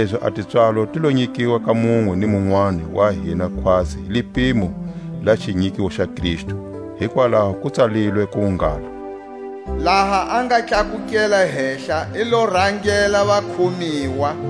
Kanilezi a tipswalo ti lo nyikiwa ka munwe ni munwani wa hina khwatsi hi lipimo la xinyikiwo xa Kristu. Hikwalaho ku tsalilwe ku ngalo: Laha a nga tlakukela hehla i lo rangela vakhomiwa,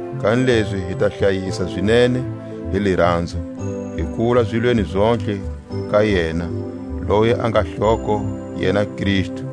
Kanilezi hi ta hlayisa zinene hi liranzo, hi kula zilweni zontlhe ka yena, loyi a nga hloko, yena Kristu,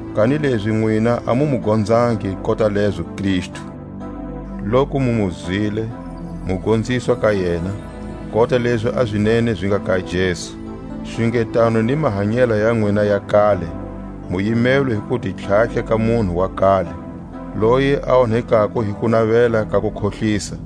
Kanilezi nwina a mu mu gonzangi kota lezo Kristu, loku mu mu zwile, mu gonziswa ka yena, kota lezi a zinene zi nga ka Jesu. Xungetano ni mahanyela ya nwina ya kale mu yimelwe hi ku ti tlhatlha ka munhu wa kale, loyi a onhekako hi kunavela ka kukhohlisa;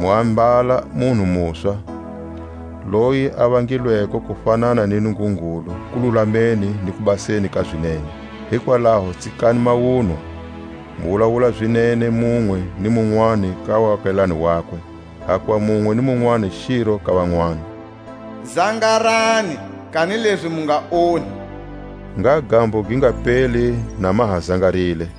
mu ambala munhu muswa, loyi a vangilweko ku fanana ni Nungungulu kululameni ni kubaseni ka zinene. Hikwalaho tsikani mawunwa, mu wulawula zinene munwe ni munwani ka waakelane wakwe, hakuva munwe ni munwani xiro ka vanwani. Zangarani, kanilezi mu nga onhi; ngha gambo gi nga peli na ma ha zangarile,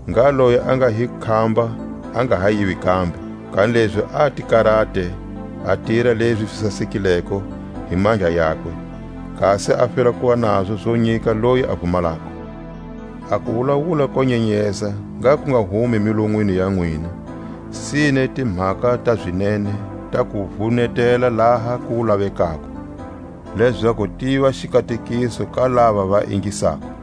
Ngha loyi a nga hi khamba a nga ha yivi kambe; kanilezi a ti karate a tira lezi zi sasekileko hi mandla yakwe, kasi a fela kuva nazo zo nyika loyi a vumalako. A kuwulawula ko nyenyeza ngha ku nga humi milonwini ya nwina, sine timhaka ta zinene ta ku vunetela laha ku lavekako, lezaku tiva xikatekiso ka lava va ingisako.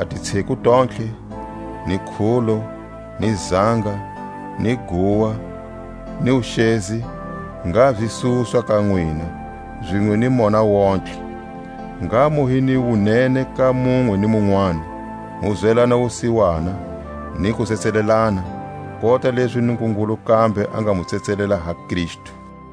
A titsheku tontlhe, ni khulo, ni zanga, ni guwa, ni wuxezi, ngha zi suswa ka nwina, zinwe ni mona wontihe. Ngha mu hi ni wunene ka munwe ni munwani, mu zwelana wusiwana, ni ku tsetselelana, kota lezi Nungungulu kambe a nga mu tsetselela ha Kristu.